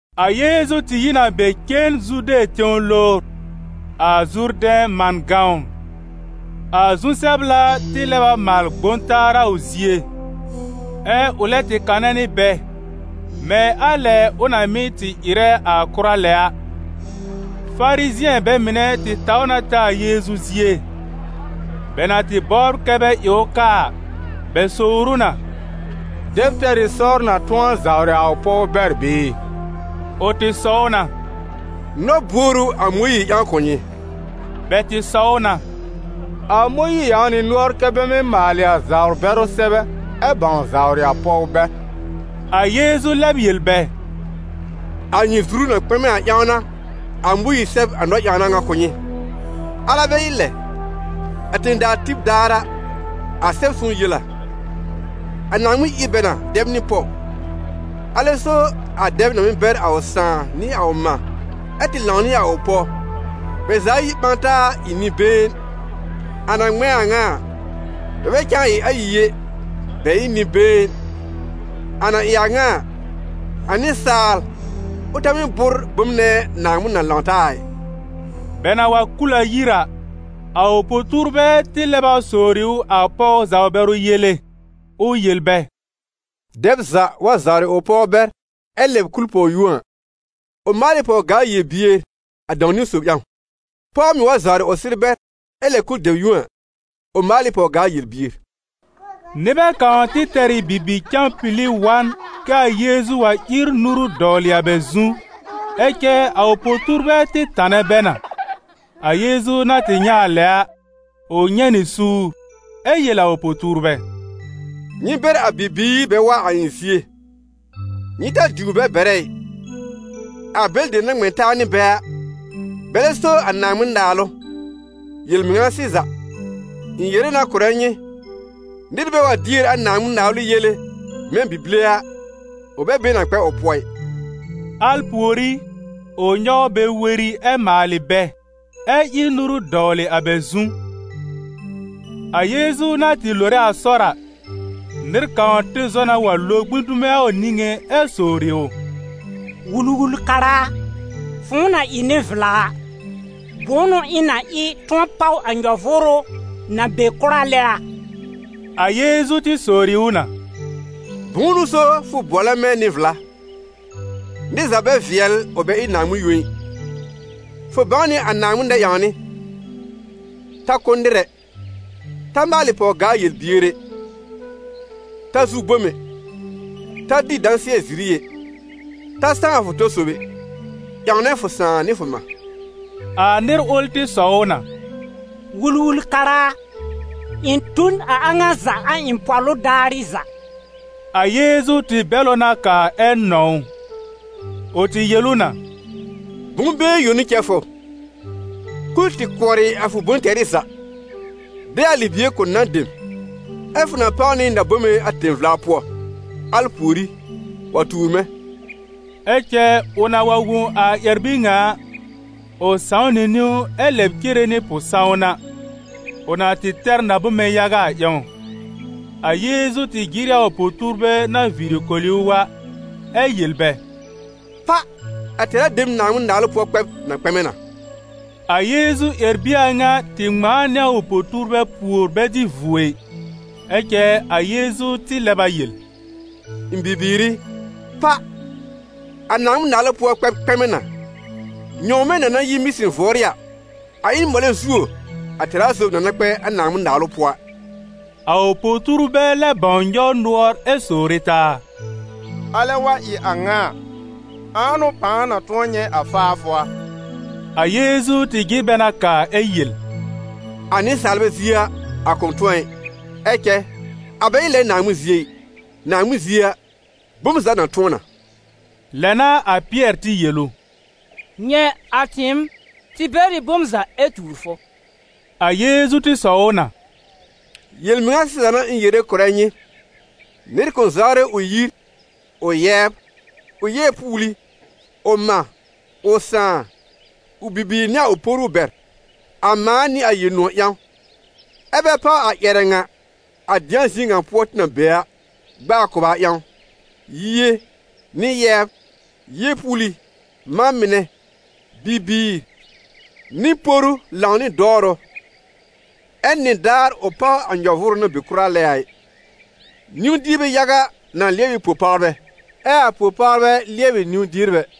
A Yeezu tɩ yi n a be cen zude tẽw lowr, a Zurdɛ̃ man gãwn. A zu-sɛbla tɩ lɛb a maal gbõ taa a ʋ zie, ɛ ʋ lɛ tɩ kanɛ nɩ bɛ, mɛ̃ a lɛ ʋ na mɩ́ tɩ ɩrɛ a kʋra lɛ a. Farizɩ̃ɛ bɛ mɩnɛ tɩ taw na ta a Yeezu zie; bɛ na tɩ bɔbr kɛ bɛ ɩ ʋ kaa a, bɛ sowr ʋ na: «Dɛb tɛr ɩ sɔr na tʋ̃ɔ zawrɩ a ʋ pɔw bɛr bɩɩ?» Ʋ tɩ sɔw na: «Nɔ-buor ʋ a Mõyiir ƴãw kʋ̀ nyɩ?» Bɛ tɩ sɔw na: «A Mõyiir ƴãw nɩ nʋɔr kɛ́ bɛ mɩ́ maalɩ a zawr-bɛrʋ sɛbɛ, ɛ bãw zawrɩ a pɔw bɛr.» A Yeezu lɛb yel bɛ: «A nyɩ zuru na kpɛmɛ a ƴãw n'a a Mõyiir sɛb a nɔ-ƴãwna ŋa kʋ̀ nyɩ. Alɛ bɛ ɩ lɛ, a tẽ-daa tib daar a, a Sɛb-sõw yel a: ‹Naaŋmɩn ír bɛ na dɛb nɩ pɔw;› ‹alɛ so a dɛb na mɩ́ bɛr a ʋ sãà nɩ a ʋ mã ɛ tɩ lãw nɩ a ʋ pɔw, bɛ za ayi ɓã taa ɩ nɩ-been. A na ŋmɛ̃ a ŋa a, bɛ bɛ cã ɩ ayi ɛ, bɛ ɩ n nɩ-been.› A na ɩ a ŋa a, a nɩsaal, ʋ ta mɩ́ bʋ́r bom nɛ a Naaŋmɩn na lãw taa a ɩ.» Bɛ na wa kul a yir a, a ʋ po-tuurbɛ tɩ lɛb a sowri ʋ a pɔw zawr-bɛrʋ yele, ʋ yel bɛ: «Dɛb za wa zawrɩ ʋ pɔw bɛr ɛ lɛb kul pɔw yũo a, ʋ maal ɩ pɔw-gaa yel-bier a dãw-niwn sob ƴãw. Pɔw mɩ̀ wa zawrɩ ʋ sɩr bɛr ɛ lɛb kul dɛb yũo a, ʋ maal ɩ pɔw-gaa yel-bier.» Nɩbɛ kãw tɩ tɛr ɩ bibi-cãpili wa n kɛ a Yeezu wa ír nuru dɔwlɩ a bɛ zu, ɛ cɛ a ʋ po-tuurbɛ tɩ tanɛ bɛ na. A Yeezu na tɩ nyɛ̃ a lɛ a, ʋ nyɛ̃ nɩ suur, ɛ yel a ʋ po-tuurbɛ: «Nyɩ bɛr a bibiir bɛ wa a ɩ̃ zie, nyɩ ta diwr bɛ bɛrɛ ɩ, a bɛlɩ dem na ŋmɛ̃ taa nɩ bɛ a, bɛlɛ so a Naaŋmɩn-Naalʋ. Yel-mɩŋa sɩza, ɩ̃ yere na kʋ̀rɛ nyɩ, nɩr bɛ wa dier a Naaŋmɩn-Naalʋ yele mɛ̃ bi-bile a, ʋ bɛ be na kpɛ ʋ pʋɔ ɩ.» Al pùorí, ʋ nyɔw bɛ weri ɛ maalɩ bɛ, ɛ ír nuru dɔwlɩ a bɛ zu. A Yeezu na tɩ lore a sɔr a, nɩr kãw tɩ zɔ na wa lo gbĩ dume a ʋ niŋé ɛ sowri ʋ: «Wul-wul-kara a, fʋ̃ʋ na ɩ nɩ-vla a, bʋ̃ʋ n'ʋ ɩ̃ na ɩ tʋ̃ɔ páw a nyɔ-vʋʋrʋ na be kʋra lɛ a?» A Yeezu tɩ sowri ʋ na: «Bʋ̃ʋ n'ʋ so fʋ bʋɔlɛ mɛ̃ nɩ-vla? Nɩr za bɛ vɩɛl ʋ bɛ ɩ Naaŋmɩn yõ ɩ. Fʋ bãw nɩ a Naaŋmɩn nɛ-ƴãwnɩ: ‹Ta kʋ́ nɩr ɛ; ta maalɩ pɔw-gaa yel-bier ɛ; ta zu bom ɛ; ta dɩ dãsɩɛ-ziri ɛ; ta sãw fʋ tɔ sob ɛ; ƴãwnɛ fʋ sãà nɩ fʋ mã.›» A nɩr ʋl tɩ sɔw ʋ na: «Wul-wul-kara a, ɩ̃ tu n a a ŋa za a ɩ̃ pɔ̀lʋ daarɩ za.» A Yeezu tɩ bɛl ʋ na kaa ɛ nɔ̃w ʋ. Ʋ tɩ yel ʋ na: «Bʋ̃-been yõ n'ʋ cɛ fʋ: kul tɩ kʋɔrɩ a fʋ bʋ̃-tɛrɩ za, de a libie kʋ̀ nan dem, ɛ fʋ na páw nɩ na-bome a tẽ-vla pʋɔ. Al pùorí, wa tuur mɛ̃.» Ɛ cɛ ʋ na wa wõ a ƴɛr-bir ŋa a, ʋ sãw nɩ niwn ɛ lɛb cere nɩ pʋ-sãwna, ʋ na tɩ tɛr na-bome yaga a ƴãw. A Yeezu tɩ jɩr ɩ a ʋ po-tuurbɛ na viiri koli ʋ a, ɛ yel bɛ: «Pa! A tɛra dem Naaŋmɩn-Naalʋ pʋɔ kpɛb na kpɛmɛ na!» A Yeezu ƴɛr-bie a ŋa tɩ ŋmãa nɩ a ʋ po-tuurbɛ pùor bɛ dɩ vuo ɩ. Ɛ cɛ a Yeezu tɩ lɛb a yel: «Ɩ̃ bibiir i, pa! A Naaŋmɩn-Naalʋ pʋɔ kpɛb kpɛmɛ na. Nyɔ̃wmɛ̃ na na yi mɩ̃sɩn vʋɔrɩ a, a ɩ n mɔlɛ zuo a tɛra sob na na kpɛ a Naaŋmɩn-Naalʋ pʋɔ a.» A ʋ po-tuurbɛ lɛ bãw nyɔw nʋɔr ɛ sowre taa: «Alɛ wa ɩ a ŋa a, ãa n'ʋ pãa na tʋ̃ɔ nyɛ̃ a faafʋ a?» A Yeezu tɩ jɩr bɛ na kaa ɛ yel: «A nɩsaalbɛ zie a, a kʋ̃ tʋ̃ɔ ɩ, ɛ cɛ a bɛ ɩ lɛ Naaŋmɩn zie ɩ, Naaŋmɩn zie a, bom za na tʋ̃ɔ na.» Lɛ n'a a Pɩɛr tɩ yel ʋ: «Nyɛ̃, a tɩɩm, tɩ bɛr ɩ bom za ɛ tuur fʋ.» A Yeezu tɩ sɔw ʋ na: «Yel-mɩŋa sɩza n'a ɩ̃ yere kʋ̀rɛ nyɩ: nɩr kʋ̃ zawrɩ ʋ yir, ʋ yɛbr, ʋ yeepuuli, ʋ mã, ʋ sãà, ʋ bibiir nɩ a ʋ poru bɛr, a mãa nɩ a Yel-nʋ̃ɔ̀ ƴãw, ɛ́ bɛ páw a ƴɛrɛ ŋa, a dɩ̃a zie ŋa pʋɔ tɩ na be a, gb'aa kʋba ƴãw, yie, nɩ yɛbr, yeepuuli, mã mɩnɛ, bibiir, nɩ poru lãw nɩ dɔwrʋ, ɛ nɩdaar ʋ páw a nyɔ-vʋʋrʋ na be kʋra lɛ a ɩ. Niw-dierbɛ yaga na lɩɛb ɩ po-pawrbɛ, ɛ a po-pawrbɛ lɩɛbɩ niw-dierbɛ.»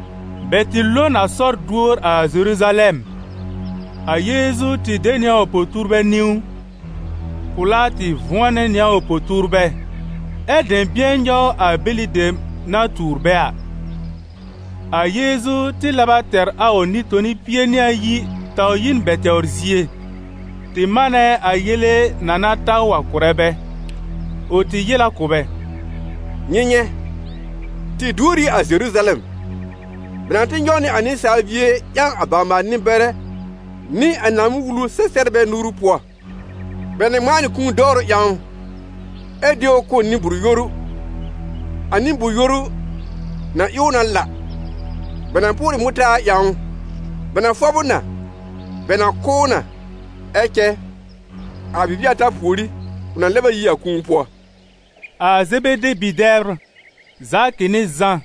Bɛ tɩ lo n a sɔr duor a Zeruzalɛm. A Yeezu tɩ de nɩ a ʋ po-tuurbɛ niwn. Pʋ̀lá tɩ vʋ̃ɔnɛ nɩ a ʋ po-tuurbɛ, ɛ́ dɛ̃bɩ̃ɛ nyɔw a bɛlɩ dem na tuur bɛ a. A Yeezu tɩ lɛb a tɛr a Nɩ-toni pie nɩ ayi taw yi n bɛ tɛwr zie, tɩ manɛ a yele na na ta ʋ a kʋ̀rɛ bɛ. Ʋ tɩ yel a kʋ̀ bɛ: «Nyɩ nyɛ̃, tɩ duor ɩ a Zeruzalɛm, bɛ na tɩ nyɔw nɩ a Nɩsaal Bie ƴãw a bawr-maal-nɩ-bɛrɛ nɩ a Naaŋmɩn-Wulu-sɛ-sɛbrbɛ nuru pʋɔ. Bɛ na ŋmãa nɩ kũu dɔwrʋ ƴãw ʋ, ɛ de ʋ kʋ̀ nɩ-bʋʋr-yoru. A nɩ-bʋʋr-yoru na ɩ ʋ na la, bɛ na pʋʋrɩ mʋtaar ƴãw ʋ, bɛ na fɔb ʋ na, bɛ na kʋ́ ʋ na, ɛ cɛ a bibie ata pùorí, ʋ na lɛb a yi a kũu pʋɔ.» A Zebede bi-dɛbr, Zakɩ nɩ Zã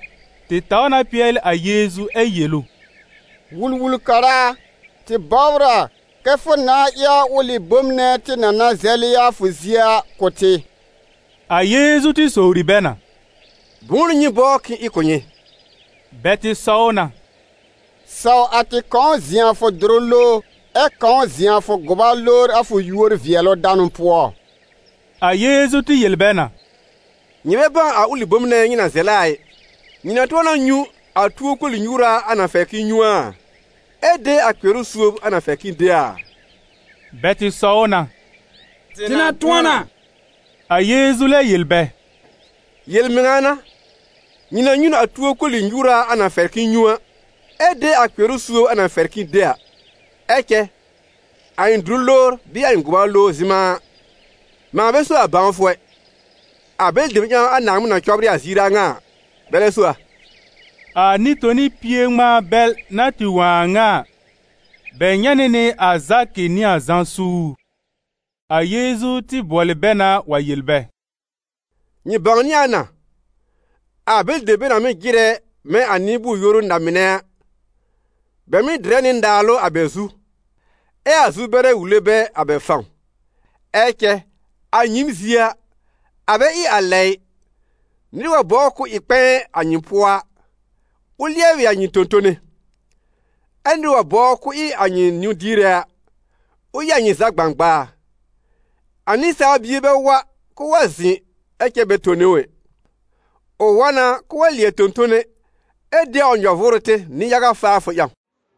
tɩ taw na pɩɛlɩ a Yeezu ɛ yel ʋ: «Wul-wul-kara a, tɩ bɔbr a kɛ fʋ nãa ɩ a ʋlɩ bom nɛ tɩ na na zɛlɩ a fʋ zie a kʋ̀ tɩ!» A Yeezu tɩ sowri bɛ na: «Bʋ̃ʋ n'ʋ nyɩ bɔbr k'ɩ̃ɩ ɩ kʋ̀ nyɩ?» Bɛ tɩ sɔw na: «Saw a tɩ kãw zɩ̃ a fʋ dʋrʋ lowr, ɛ kãw zɩ̃ a fʋ gʋba lowr a fʋ yúor-vɩɛlʋ-danʋ pʋɔ.» A Yeezu tɩ yel bɛ na: «Nyɩ bɛ bãw a ʋlɩ bom nɛ nyɩ na zɛlɛ a ɩ. Nyɩ na tʋ̃ɔ na nyũ a tuo koli-nyuura a na fɛr k'ɩ̃ɩ nyũ a, ɛ de a kpɩɛrʋ suob a na fɛr k'ɩ̃ɩ de a?» Bɛ tɩ sɔw na: «Tɩ na tʋ̃ɔ na!» A Yeezu lɛ yel bɛ: «Yel-mɩŋa n'a, nyɩ na nyũ n a tuo koli-nyuura a na fɛr k'ɩ̃ɩ nyũ a, ɛ de a kpɩɛrʋ suob a na fɛr k'ɩ̃ɩ de a. Ɛ cɛ, a ɩ̃ dʋrʋ lowr bɩɩ a ɩ̃ gʋba lowr zɩ̃ma a, mãa bɛ so a bãwfʋ ɛ; a bɛlɩ dem ƴãw a Naaŋmɩn na cɔbrɩ a ziir a ŋa a, bɛlɛ so a.» A Nɩ-toni pie ŋmãa bɛl na tɩ wõ a a ŋa a, bɛ nyɛ̃ nɩ nɩ a Zakɩ nɩ a Zã suur. A Yeezu tɩ bʋɔlɩ bɛ na wa yel bɛ: «Nyɩ bãwnɩ a na: a bɛlɩ dem bɛ na mɩ́ jɩrɛ mɛ̃ a nɩ-bʋʋr-yoru na-mɩnɛ a, bɛ mɩ́ dɩrɛ nɩ naalʋ a bɛ zu, ɛ a zu-bɛrɛ wule bɛ a bɛ fãw. Ɛ cɛ a nyɩɩm zie a, a bɛ ɩ a lɛ ɩ: nɩr wa bɔbr k'ʋʋ ɩ kpɛ̃ɛ a nyɩ pʋɔ a, ʋ lɩɛbɩ a nyɩ tõ-tone. Ɛ nɩr wa bɔbr k'ʋʋ ɩ a nyɩ nĩw-diere a, ʋ ɩ a nyɩ za gbãgbaa. A Nɩsaal Bie bɛ wa k'ʋʋ wa zɩ̃ ɛ cɛ bɛ tone ʋ ɛ, ʋ wa na k'ʋʋ wa lɩɛb tõ-tone, ɛ de a ʋ nyɔ-vʋʋrʋ tɩr nɩ-yaga faafʋ ƴãw.»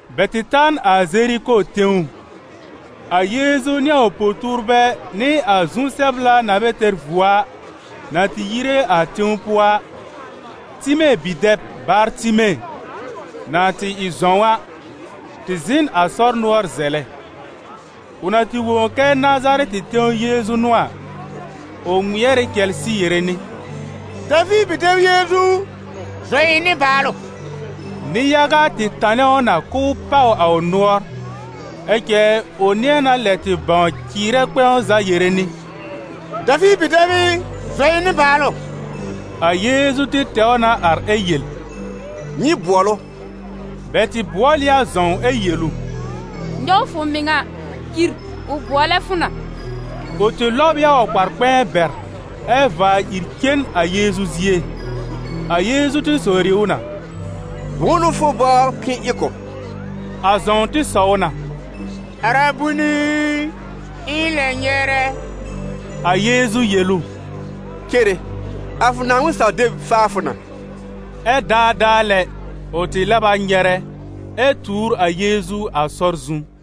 Bɛ tɩ ta n a Zeriko tẽw. A Yeezu nɩ a ʋ po-tuurbɛ nɩ a zu-sɛbla na bɛ tɛr vuo a, na tɩ yire a tẽw pʋɔ a, Time bi-dɛb, Bartime, na tɩ ɩ zɔ̃w a, tɩ zɩ̃ n a sɔr nʋɔr zɛlɛ. Ʋ na tɩ wõ kɛ Nazarɛtɩ tẽw Yeezu n'ʋ a, ʋ ŋmɩɛr ɩ cɛlsɩ yere nɩ: « Daviir bi-dɛb Yeezu u, zɔ ɩ̃ nɩbaalʋ!» Nɩ-yaga tɩ tanɛ ʋ na k'ʋʋ pàw a ʋ nʋɔr. Ɛ cɛ ʋ nɩ̃ɛ na lɛb tɩ bãw cɩɩrɛ kpɛ̃w za yere nɩ: « Daviir bi-dɛb ɩ, zɔ ɩ̃ nɩbaalʋ!» A Yeezu tɩ tɛw na ar ɛ yel: «Nyɩ bʋɔl ʋ.» Bɛ tɩ bʋɔl ɩ a zɔ̃w ɛ yel ʋ: «Nyɔw fʋ mɩŋa, ìr, ʋ bʋɔlɛ fʋ na!» Ʋ tɩ lɔb ɩ a ʋ kpar-kpɛ̃ɛ bɛr, ɛ vaa ìr cen a Yeezu zie. A Yeezu tɩ sowri ʋ na: «Bʋ̃ʋ n'ʋ fʋ bɔbr k'ɩ̃ɩ ɩ kʋ̀ b?» A zɔ̃w tɩ sɔw na: «Arabuni i, ɩ̃ lɛ nyɛrɛ!» A Yeezu yel ʋ: «Cere, a fʋ Naaŋmɩn-saw-deb faa fʋ na!» Ɛ daadaa lɛ, ʋ tɩ lɛb a nyɛrɛ, ɛ tuur a Yeezu a sɔr zu.